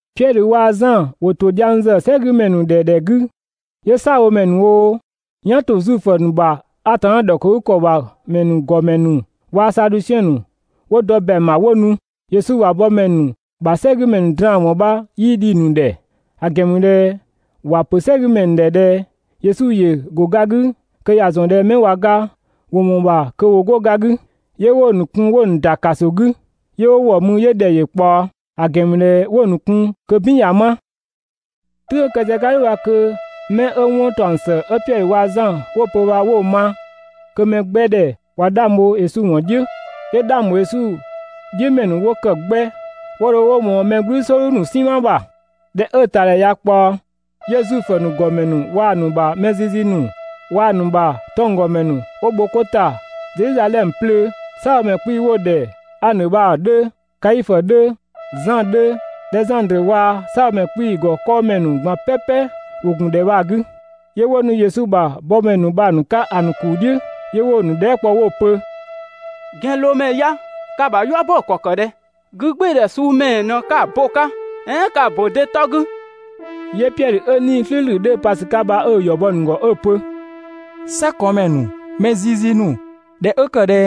Piɛdhö waa‑ Zan ‑wo ‑to dhiang ‑zë "sɛgümɛ ‑nu ‑dhɛ ‑dhɛ 'gü, 'yö "saabhomɛ ‑nu oo, "yan ‑to Zuifö ‑nu ‑bha Atanna ‑dhɔkëgükɔ ‑bha ‑mɛ ‑nu ‑gɔmɛ ‑nu waa‑ Sadusiɛn ‑nu 'wo dɔ ‑bɛang ‑bha 'wo nu. Yesu ‑bha bɔmɛ ‑nu ‑bha "sɛgümɛ ‑nu draan‑ ‑wɔn bha 'yii dhi‑ ‑nu ‑dhɛ, ‑a ‑gɛn ‑mü ꞊dhɛ ‑wa ‑pö "sɛgümɛ ‑nu ‑dhɛ ꞊dhɛ Yesu ‑yö ‑go ga 'gü kö ‑ya ‑zɔn ꞊dhɛ 'mɛ ꞊wa ga ‑wo ‑mɔɔ ‑bha kö ‑wo 'go ga 'gü. 'Yö 'wo‑ ‑nu kun 'wo‑ ‑nu ‑da ‑kaso 'gü, 'yö 'wo ‑wɔ mü 'yö ‑dhɛ ‑yö ꞊kpaɔ. ‑A ‑gɛn ‑mü ꞊dhɛ 'wo‑ ‑nu kun kö "bin ꞊ya 'ma. "Tʋ̈ng 'ö kë sië‑ 'ka "dhʋ̈ bha kö 'mɛ 'ö 'wɔn ‑taɔng ‑së 'ö Piɛdhö waa‑ Zan 'wo‑ pö bha 'wo‑ ma, kö‑ mɛ 'gbɛ ‑dhɛ ꞊wa 'dhang bho Yesu ‑wɔn "dhiʋ̈. 'Yö 'dhang ‑bho Yesu "dhiʋ̈ ‑mɛ ‑nu 'wo kë 'gbɛ 'wo dho 'wo ‑mɔɔ mɛ "gblü "sɔɔdhu ‑nu "sinma ‑bha. ꞊Dhɛ 'ö‑ ‑tadhɛ ꞊ya ꞊kpaɔ, 'yö Zuifö ‑nu ‑gɔmɛ ‑nu waa‑ ‑nu ‑bha mɛ zizi ‑nu waa‑ ‑nu ‑bha 'tɔnggɔmɛ ‑nu 'wo bho 'ko ‑ta Zedhizadhɛmö 'plöö. "Saabhomɛ 'kpii‑ 'wo‑ ‑dhɛ Anö bha‑ 'dhö, Kaifö 'dhö, Zan 'dhö, Dhɛzandrö waa‑ "saabhomɛ 'kpii‑ ‑gɔ 'kɔɔmɛ ‑nu ꞊gban "pɛpɛ ‑wo ‑gun ‑dhɛ bha‑ 'gü. 'Yö 'wo nu Yesu ‑bha bɔmɛ ‑nu bha‑ ‑nu 'ka ‑a ‑nu ‑kuu "dhiʋ̈, 'yö 'wo‑ ‑nu dhɛɛ" kpɔ 'wo‑ pö: «‑Gɛnloomɛ ya ka‑ ‑bha "yua bo ‑kɔ ‑kë ꞊dhɛ? 'Gügbɩɩdhɛ suu ‑mɛɛ ꞊në 'ka‑ bo‑ 'ka, "ɛɛn ka‑ ‑bo de 'tɔ 'gü?» 'Yö Piɛdhö 'ö 'Nii‑ "slʋ̈ʋ̈slʋ̈‑ 'dhö‑ pa ‑sü 'ka bha 'ö‑ ‑yɔ bɔ‑ ‑nu ‑gɔ 'ö‑ pö: «"Sɛkɔɔnmɛ ‑nu, mɛ zizi ‑nu, ꞊dhɛ 'ö ‑kë ꞊dhɛ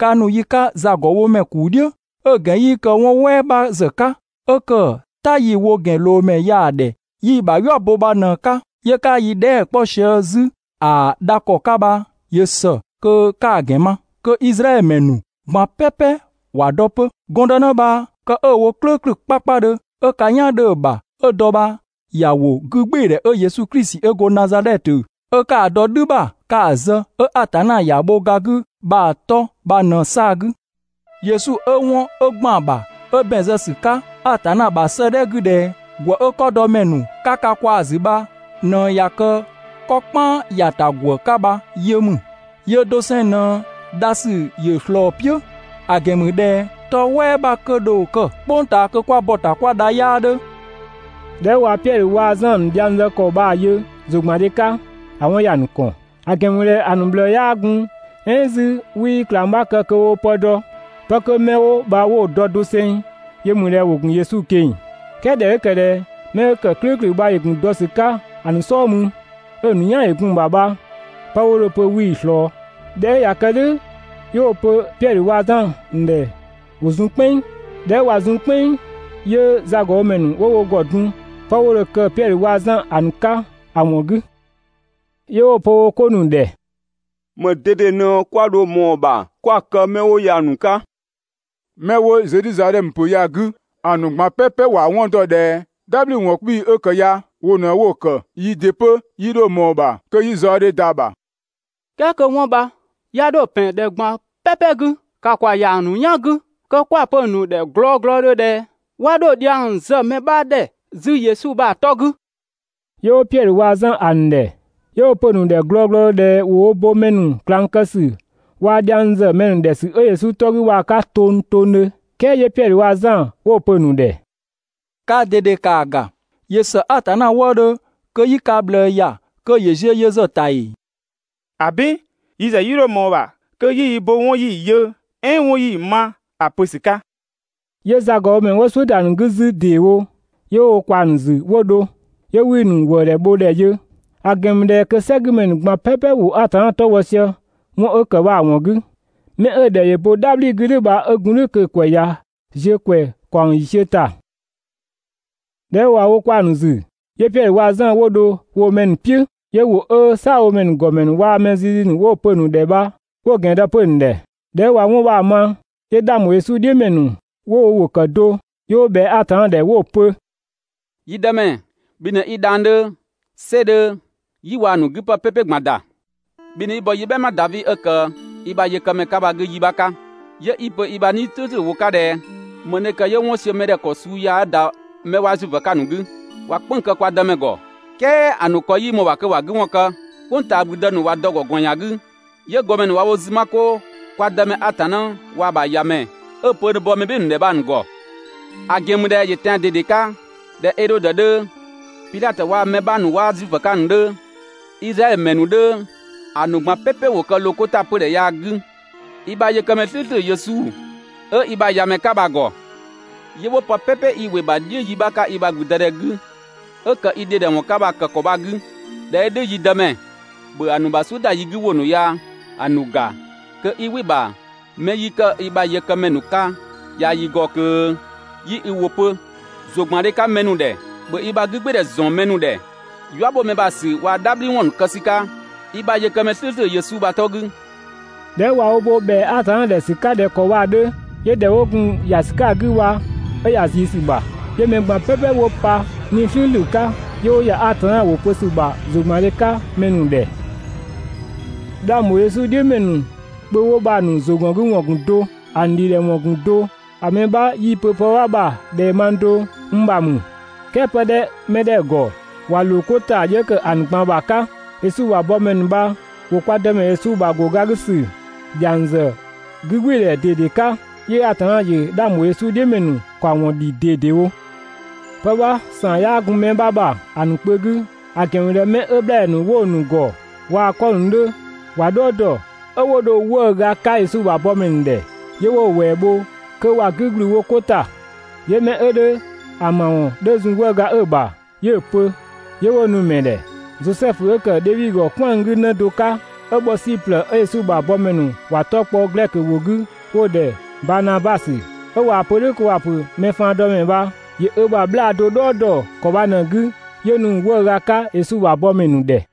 'ka nu yi 'ka zagɔbhomɛ ‑kuu "dhiʋ̈, 'ö‑ ‑gɛn 'yii kë 'wɔn "wɛɛ 'bha ‑zë 'ka 'ö ‑kë "ta 'yi‑ wo ‑gɛnloomɛ ya‑ ‑dhɛ 'yi‑ ‑bha "yua bo bha ꞊në‑ 'ka, 'yö 'ka yi dhɛɛ" 'kpɔ sië 'zü ‑a dha ‑kɔ 'ka bha, ‑yö ‑së kö 'ka‑ ‑gɛn ma, kö Izraɛdhö ‑mɛ ‑nu ꞊gban "pɛpɛ ‑wa dɔ 'pö. Gɔndënë bha kë 'ö‑ wo "klʋ̈ʋ̈klʋ̈ 'kpakpadhö 'ö ka "yan 'dhö‑ ‑bha 'ö dɔ bha ‑ya ‑wo 'gügbɩɩdhɛ 'ö Yesu Klisi 'ö go Nazadhɛtö, 'ö 'ka‑ dɔ "dhü ‑bha 'ka‑ zë, 'ö Atanna ‑ya bho ga 'gü bha‑ 'tɔ bha ꞊në‑ 'saa‑ 'gü. Yesu 'ö 'wɔn 'ö ‑gban ‑bha 'ö ‑bɛn zë ‑sü 'ka Atanna ‑bha 'sëëdhɛ 'gü ꞊dhɛ: ‹‑Gwë 'ö 'kɔdɔmɛ ‑nu 'ka ka ꞊kwaa‑ ‑zü bha ꞊në ꞊ya kë 'kɔ "kpan ‑ya ‑ta ‑gwë 'ka bha yö ‑mü›. Yöö doseng ꞊në dha ‑sü ‑yö ꞊slɔɔ‑ "piʋ̈, ‑a ‑gɛn ‑mü ꞊dhɛ 'tɔ "wɛɛ 'bha kö dho kë "kpʋng ꞊taa kö 'kwa bɔ‑ ‑ta 'kwa dha 'yaa 'dhö.» ꞊Dhɛ 'ö ꞊wa Piɛdhö waa‑ Zan ‑nu dhiang zë ‑kɔ bha‑ yö ‑zʋgbandhe 'ka, ‑a 'wɔn ‑ya ‑nu ‑kɔn, ‑a ‑gɛn ‑mü ꞊dhɛ ‑a ‑nu ꞊bhlëë 'yaa gun "ɛɛn 'zü 'wii ꞊klang 'bha kë kö woo pë dɔ, 'pë 'mɛ 'kö 'wo bha 'wo‑ dɔ doseng yö ‑mü ꞊dhɛ ‑wo ‑gun Yesu ꞊keng‑. "Kɛɛ ꞊dhɛ 'ö ‑kë ꞊dhɛ 'mɛ 'ö ‑kë "klʋ̈ʋ̈klʋ̈ bha ‑yö ‑gun dɔ ‑sü 'ka‑ ‑nu "sɔɔ mü, 'ö‑ ‑nu "yan ‑yö gun‑ ‑bha bha, 'pë 'wo dho‑ pö 'wii‑ ꞊slɔɔ. ꞊Dhɛ 'ö ꞊ya kë "dhʋ̈ 'yö 'wo‑ pö Piɛdhö waa‑ Zan ‑nu ‑dhɛ ‑wo zun "kpɛnng. ꞊Dhɛ 'ö ꞊wa zun "kpɛnng, ‑yö zagɔbhomɛ ‑nu 'wo wo ‑gɔ dun 'pë 'wo dho‑ kë Piɛdhö waa‑ Zan ‑a ‑nu 'ka ‑a ‑wɔn 'gü. 'Yö 'wo‑ pö wo 'ko ‑nu ‑dhɛ: «‑Më ꞊dede ꞊në 'kwa dho ꞊mɔɔ‑ ‑bha 'kwa‑ kë 'mɛ 'wo ya‑ ‑nu 'ka? 'Mɛ 'wo Zedhizadhɛmö ‑pö ya‑ 'gü ‑a ‑nu ꞊gban "pɛpɛ ‑wa 'wɔn ‑dɔ ꞊dhɛ "dhabhliwɔn 'kpii‑ 'ö ‑kë ya wo ꞊në 'wo‑ ‑kë, yii ‑dɩ 'pö 'yii 'dho ꞊mɔɔ‑ ‑bha kö 'yi zaɔdhe ‑da ‑bha. "Kɛɛ kö 'wɔn bha 'ya 'dho ‑pɛn ‑dhɛ ꞊gban "pɛpɛ 'gü, ‑ka ‑kwa ‑ya ‑a ‑nu "yan 'gü kö 'kwa‑ pö‑ ‑nu ‑dhɛ glɔglɔdhö ꞊dhɛ 'wa 'dho dhiang zë mɛ 'bha ‑dhɛ 'zü Yesu bha‑ 'tɔ 'gü!» 'Yö 'wo Piɛdhö waa‑ Zan ‑a ‑nu ‑dhɛ, 'yö 'wo‑ pö‑ ‑nu ‑dhɛ glɔglɔdhö ꞊dhɛ ‑wo wo bo mɛ ‑nu ꞊klang kë ‑sü waa‑ dhiang ‑zë mɛ ‑nu ‑dhɛ ‑sü 'ö Yesu 'tɔ 'gü bha‑ 'ka tongtongdhö. "Kɛɛ 'yö Piɛdhö waa‑ Zan 'wo‑ pö‑ ‑nu ‑dhɛ: «Kaa ꞊dede ‑kaa ‑ga, ‑yö ‑së Atanna wëëdhö kö 'yi ka ꞊bhlëë ‑ya kö ‑yö ziö yö ‑zë ‑bha ‑ta ‑ee? ‑Abin! Yi ‑zë 'yii 'dho ꞊mɔɔ‑ ‑bha kö 'yi yi bo 'wɔn 'yi‑ yö, "ɛɛn 'yi‑ ma ‑a pö ‑sü 'ka!» 'Yö zagɔbhomɛ ‑nu 'wo "suʋ̈ ‑da ‑nu 'gü 'zü ‑deewo, 'yö 'wo wo ꞊kwaa‑ ‑nu ‑zü 'wo dho. 'Yö 'wii‑ ‑nu ‑wëëdhɛ bho ‑dhɛ yö, ‑a ‑gɛn ‑mü ꞊dhɛ kö "sɛgümɛ ‑nu ꞊gban "pɛpɛ ‑wo Atanna 'tɔ bhɔ sië 'wɔn 'ö ‑kë bha‑ ‑wɔn 'gü. 'Mɛ 'ö‑ ‑dhɛ ‑yö bo "dhabhli 'gü "dhʋ̈ bha 'ö gun "dhʋ̈ kö‑ ‑kwɛ ꞊ya ziö ‑kwɛ ‑kaɔng ‑yiisiö ‑ta. ꞊Dhɛ 'ö ꞊wa wo kwaa‑ ‑nu ‑zü, 'yö Piɛdhö waa‑ Zan 'wo dho woo‑ mɛ ‑nu "piʋ̈, 'yö ‑wʋ 'ö "saabhomɛ ‑gɔmɛ ‑nu waa‑ mɛ zizi ‑nu 'wo‑ pö‑ ‑nu ‑dhɛ bha 'wo‑ ‑gɛn dɔ 'pö‑ ‑nu ‑dhɛ. ꞊Dhɛ 'ö ꞊wa 'wɔn bha‑ ma, 'yö 'dhang ‑bho Yesu "dhiʋ̈ ‑mɛ ‑nu 'wo wo ‑wʋ ‑kë do 'yö 'wo ꞊bhɛa Atanna ‑dhɛ 'wo‑ pö: «Yi Dëmɛ, bhi ꞊në 'i dhang‑ 'dhö, "sɛ 'dhö, "yi waa‑ ‑nu 'güpë "pɛpɛ ꞊gban ‑da. Bhi ꞊në 'i bɔ yi "bhɛma Davi 'ö ‑kë i ‑bha yëkëmɛ 'ka bha‑ 'gü yi 'bha 'ka, 'yö 'i‑ pö i ‑bha 'Nii‑ "slʋ̈ʋ̈slʋ̈ ‑wʋ 'ka ꞊dhɛ: ‹‑Më ꞊në ‑kë 'yö 'wɔn ‑siö mɛ ‑dhɛ ‑kɔ suu ya 'ö ‑da 'mɛ 'waa Zuifö 'ka‑ ‑nu 'gü? ꞊Wa "kpënng‑ kë kwa Dëmɛ ‑gɔ, "kɛɛ ‑a ‑nu ‑kɔ 'yii ꞊mɔɔ‑ ‑bha kö ‑wa 'gü ‑wɔn kë. "Kpʋng ꞊taa ‑gblüdë ‑nu ꞊wa dɔ‑ ‑gɔ ꞊gɔɔn ‑yan 'gü, 'yö ‑gɔmɛ ‑nu ꞊wa wo zü 'ma 'koo kwa Dëmɛ Atanna waa‑ ‑bha ‑Yamɛ 'ö‑ pö ö dho ‑a bɔ mɛ "bhɩɩ‑ ‑nu ‑dhɛ bha‑ ‑nu ‑gɔ›. ‑A ‑gɛn ‑mü ꞊dhɛ ‑yö tɛan‑ ꞊dede 'ka ꞊dhɛ Edhodö 'dhö, Pidhatö waa‑ mɛ 'bha ‑nu 'ö 'waa Zuifö 'ka ‑a ‑nu 'dhö, Izraɛdhö ‑mɛ ‑nu 'dhö, ‑a ‑nu ꞊gban "pɛpɛ ‑wo kë ‑loo wo 'ko ‑ta 'pödhɛ ya‑ 'gü i ‑bha yëkëmɛ "slʋ̈ʋ̈slʋ̈ Yesu 'ö i ‑bha ‑Yamɛ 'ka bha‑ ‑gɔ. 'Yö 'wo pë "pɛpɛ 'i ‑wɩ ‑bha "dhiʋ̈ yi 'bha 'ka i ‑bha 'gügbɩɩdhɛ 'gü, 'ö ‑kë i ‑dhidhɛwɔn 'ka bha‑ ‑kë ‑kɔ bha‑ 'gü. ꞊Dhɛ 'ö "dhʋ̈, yi Dëmɛ, ‑bhö ‑a ‑nu ‑bha "suʋ̈ ‑da yi 'gü ‑wʋ ‑nu ya‑ ‑nu ‑ga kö 'i "wɩ‑ ‑bha 'mɛ 'yi kë i ‑bha yëkëmɛ ‑nu 'ka ya yi ‑gɔ kö 'yi i ‑wʋ pö ‑zʋgbandhe 'ka mɛ ‑nu ‑dhɛ. ‑Bhö i ‑bha 'gügbɩɩdhɛ ‑zɔn mɛ ‑nu ‑dhɛ, "yua ‑bho mɛ ‑bha ‑sü waa‑ "dhabhliwɔn ‑nu kë ‑sü 'ka i ‑bha yëkëmɛ "slʋ̈ʋ̈slʋ̈ Yesu bha‑ 'tɔ 'gü.» ꞊Dhɛ 'ö ꞊wa wo bo ‑bhɛa Atanna ‑dhɛ ‑sü 'ka ꞊dhɛ ‑kɔ bha‑ 'dhö, 'yö ‑dhɛ 'wo gun ‑ya ‑sü 'ka‑ 'gü bha 'ö ‑ya ꞊zii ‑sü ‑bha, 'yö‑ ‑nu ꞊gban "pɛpɛ 'wo pa 'Nii‑ "slʋ̈ʋ̈slʋ̈ 'ka, 'yö 'wo ‑ya Atanna ‑wʋ pö ‑sü ‑bha ‑zʋgbandhe 'ka mɛ ‑nu ‑dhɛ. 'Dhang ‑bho Yesu "dhiʋ̈ ‑mɛ ‑nu kpö 'wo bha‑ ‑nu ‑zʋgɔngüwɔn ‑gun do, ‑a ‑nu ‑dhidhɛwɔn ‑gun do. ‑A mɛ 'bha 'yii‑ pö pë 'bha ‑bha ꞊dhɛ mang do n ‑bha ‑mü, "kɛɛ pë 'dhö 'mɛ 'dhɛ‑ ‑gɔ, ‑wa ‑loo 'ko ‑ta 'yö ‑kë ‑a ‑nu ꞊gban ‑bha 'ka. Yesu ‑bha bɔmɛ ‑nu bha ‑wo kwa Dëmɛ Yesu ‑bha ‑go ga 'gü ‑sü ‑dhiang ‑zë 'gügbɩɩdhɛ ꞊dede 'ka; 'yö Atanna ‑yö 'dhang ‑bho Yesu "dhiʋ̈ ‑mɛ ‑nu ‑kaɔwɔn ‑dhi ꞊dedewo. Pë 'bha ‑saan 'yaa gun mɛ 'bha ‑bha ‑a ‑nu kpö 'gü, ‑a ‑gɛn ‑mü ꞊dhɛ 'mɛ 'ö 'bhlaadhɛ ‑nu 'wo‑ ‑nu ‑gɔ waa‑ 'kɔ ‑nu 'dhö ‑wa "dhɔɔ ‑dɔ, 'ö 'wo dho‑ 'wëëga 'ka Yesu ‑bha bɔmɛ ‑nu ‑dhɛ, 'yö 'wo‑ ‑wɛɛ bho kö ‑wa 'gü ‑gblü wo 'ko ‑ta, 'yö 'mɛ 'ö 'dhö ‑a ‑ma ‑wɔn 'dhö zun 'wëëga 'ö‑ ‑bha, 'yö‑ pö, 'yö 'wo‑ nu‑ ‑mɛ ‑dhɛ. Zosɛfu 'ö ‑kë Dhevi ‑gɔ "kwɛan‑ 'gü 'në do 'ka 'ö bhɔ Siplë 'ö Yesu ‑bha bɔmɛ ‑nu ‑wa 'tɔ kpɔ (glɛkö ‑wʋ 'gü) 'wo‑ ‑dhɛ Baanabasö, ('ö ꞊waa‑ pö "dhʋ̈ kö ‑wa ‑pö mɛ faandɔmɛ bha) ‑Yö ö ‑bha 'bhlaa‑ do "dhɔɔ dɔ ‑kɔ bha ꞊në‑ 'gü 'yö nu‑ 'wëëga 'ka Yesu ‑bha bɔmɛ ‑nu ‑dhɛ.